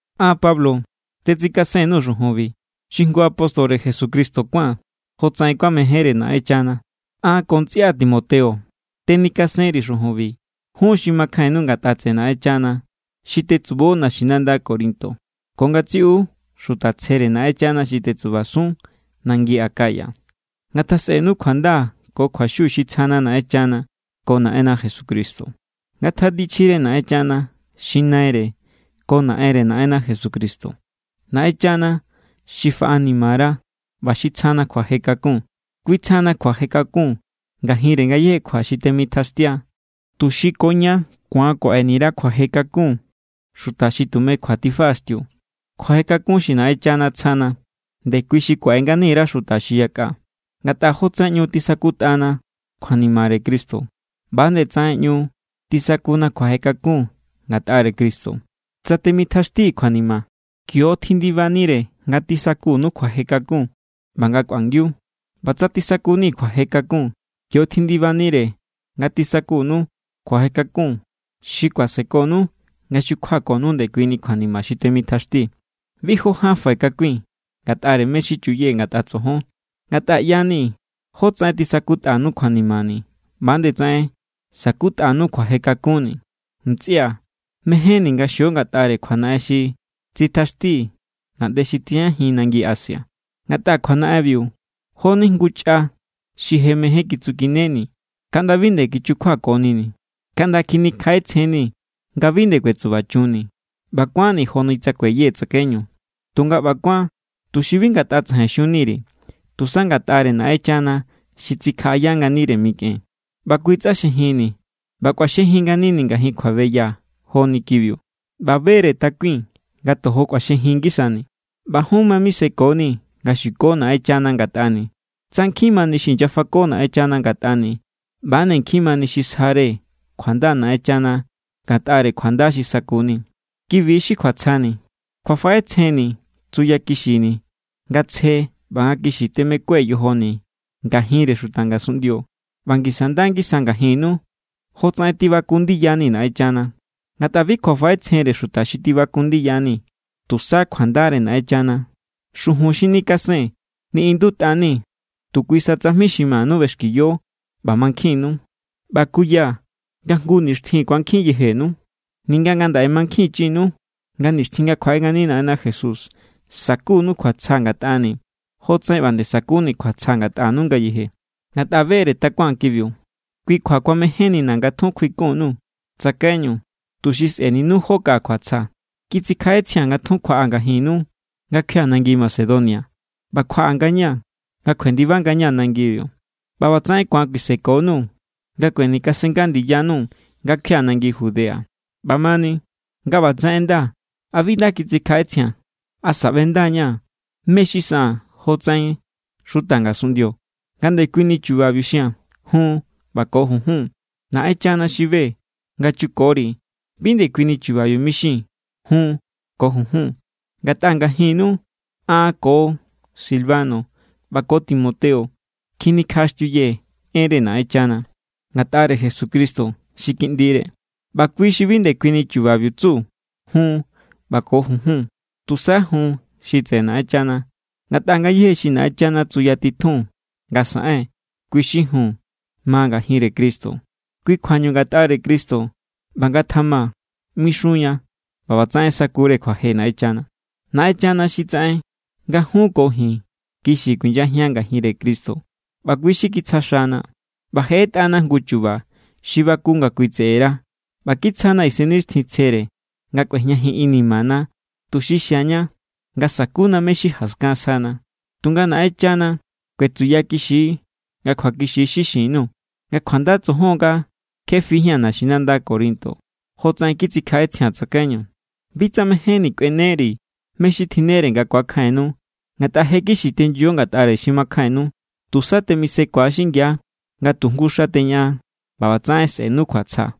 An, Pablo, tetsikasen_nuu̱ xujunbi, xi jngu apóstore Jesucristo kuáa̱n jotsaꞌen kuamejénre Naꞌenchana. An ko ntsꞌia Timoteo tenikasenri̱ xujunbi jun xi makjainnu ngatꞌa tseꞌe Naꞌenchana xi tetsubo naxinanda Corinto ko ngatsiꞌu xuta tsjere Naꞌenchana xi tetsubasun nangi Acaya. Ngatjasꞌenu kjuanda ko kjuaxiu xi tsjana Naꞌenchana ko Naꞌenna Jesucristo. Ngatanichjire Naꞌenchana xi Naire ko Naꞌenre Naꞌenna Jesucristo, Naꞌenchana xi faꞌanimara ꞌba xi tsjana kjuaje kakun. Kui tsjana kjuaje kakun ngajinre ngayéje kjua xi temitjaxtia, tuxi ko ña ku̱an kuaꞌeni_ra kjuaje kakun xuta xi tume kjua tifaꞌaxtiu. Kjuaje kakun xi Naꞌenchana tsjana, ndekui xi kuaꞌe ngani_ra xuta xi yakꞌa. Ngatꞌa jotsaꞌen ꞌñu tisakutꞌana kjuanimare Cristo, ꞌba=nde tsaꞌen ꞌñu tisakuna kjuaje kakun ngatꞌare Cristo. Tsa temitjaxtii̱ kjuanima, kio= tjindibanire nga tisakunu kjuaje kakun ꞌba nga kꞌuangiu. ꞌBa tsa tisakuni̱ kjuaje kakun, kio= tjindibanire nga tisakunu kjuaje kakun xi kuasekonu nga xukjuakonu ndekui kjuanima xi temitjaxtii̱. Bi jó ján fai̱ kakui̱n ngatꞌare mé= xi chuyee̱ ngatꞌa tsojon. Ngatꞌa ꞌya=ni jotsaꞌen tisakutꞌanu kjuanimani̱, ꞌba=nde tsaꞌen sa̱kutꞌanu kjuaje kakunni̱. Ntsꞌia̱, mejénni̱ nga xio ngatꞌare kjuanaꞌen xi tsitjaxtii̱ ngaꞌnde xi tijñajin nangi Asia. Ngatꞌa kjuanaꞌenbiu jo=ni jngu chꞌa xi je mején kitsukineni̱ kaꞌnda bi nde kichukjuakonini̱. Kaꞌnda kjinikjaꞌetsjen=nii̱ nga bi nde kuetsubachunni̱. ꞌBa kuánni̱ joni tsa kueyee̱ tsakaiñu. Tunga ꞌba kuán tuxi bi ngatꞌa tsajain xunni_ri̱, tusa ngatꞌare Naꞌenchana xi tsikjaꞌaya nganire mikꞌen. ꞌBa Kui tsꞌaxjejinni̱. ꞌBa kꞌuaxjejin nganini̱ ngajin kjuabeya joni kibiu. ꞌBa be=re takui̱n nga tojo kꞌuaxjejin ngisani̱. ꞌBa jun ma misekonii̱ nga xuko Naꞌenchana ngatꞌani̱. Tsa nkjin mani xi inyafako Naꞌenchana ngatꞌani̱, ꞌba=nde nkjin mani xi sjare kjuanda Naꞌenchana ngatꞌare kjuanda xi sakuni̱. Kibi= xi kjuatsjani̱. Kjuafaꞌetsjenni̱ tsuyakixini̱ nga tsje ꞌba nga kixi temekue̱ yojoni̱ ngajinre xuta ngasunꞌndio ꞌba ngisa nda ngisa ngajinnu, jotsaꞌen tibaku ndiyani̱ Naꞌenchana. Ngatꞌa bi kjuafaꞌetsjenre xuta xi tibaku ndiyani̱, tusa kjuandare Naꞌenchana. Xujun xi nikasee̱n niꞌindutꞌa=nii̱ tu kui sa tsajmi xi manu ꞌbexkiyo ꞌba mankjinnu. ꞌBa kuyaa̱ nga jngu nixtjin ku̱ankjin yejenu, ninga ngandaꞌe mankjinchinu nga nixtjin nga kjuaꞌe ngani Naꞌenna Jesús sa̱kunu kjuatsja ngatꞌani̱ jotsaꞌen ꞌba nde sakuni̱ kjuatsja ngatꞌanu ngayeje. Ngatꞌa be=re takuaa̱n kibiu, kui kjua kuamejénnina̱ nga tjun kjuikun_nuu̱ tsakaiñu, tuxi sꞌe̱ninu jó kaꞌa kjuatsja. Kitsikjaꞌetsjia̱n nga tjun kjuaꞌaa̱ ngajinnu nga kjuia̱ nangi Macedonia ꞌba kjuaꞌa ngañaa̱ nga kjuendiba ngañaa̱ nangibiu. ꞌBa ꞌbatsaꞌen ku̱an kuisekonuu̱ nga kuenikasennga ndiyanu nga kjuia̱ nangi Judea. ꞌBamani, nga ꞌbatsaꞌen ꞌenda, ¿a bi nda kitsikjaꞌetsjia̱n? ¿Asa ꞌbenda=ña̱ mé= xi saꞌaa̱n jotsaꞌen xuta ngasunꞌndio, nga ndekuini chubabiu xia̱n “jun” ꞌba ko “junjun”? Naꞌenchana xi be= nga chukori̱ bi ndekuini chubabiu mixii̱n “jun” ko “junjun.” Ngatꞌa ngajinnu an ko Silvano ꞌba ko Timoteo kjinikjaꞌaxtiuyee̱ enre Naꞌenchana ngatꞌare Jesucristo xi Kiꞌndire, ꞌba Kui xi bi ndekuini chubabiu tsu “jun” ꞌba ko “junjun.” Tusa “jun” xi tseꞌe Naꞌenchana. Ngatꞌa ngayéje xi Naꞌenchana tsuyatitjun nga saꞌen, kui xi “jun” ma ngajinre Cristo. Kui= kjuañu ngatꞌare Cristo “ꞌba ngatjama” mixunña ꞌba ꞌbatsaꞌen sakure kjuaje Naꞌenchana. Naꞌenchana xi tsaꞌen nga jun ko ji̱n kixi kuinyajian ngajinre Cristo ꞌba kui= xi kitsja xana. ꞌBa je ꞌetꞌana jngu chu̱ba̱ xi baku nga Kui tseꞌera ꞌba kitsjana Isennixtjintsjere nga kꞌuejñajin inimana, tuxi xiaña nga sakuna mé= xi jaskan sjana. Tunga Naꞌenchana kuetsuyakixi nga kjuakixi= xi xin_nuu̱ nga kjuanda tsojon nga kje fijía̱n naxinanda Corinto jotsaꞌen kitsikjaꞌetsjia̱n tsakaiñu. Bi tsa mejénni̱ kꞌueneri̱ mé= xi tjinnere nga ku̱akjainnu, ngatꞌa je= kixi tenyo ngatꞌare xi makjainnu. Tusa temisekua xingia nga tu jngu xa xi teñaꞌan, ꞌba ꞌbatsaꞌen sꞌe̱nu kjuatsja.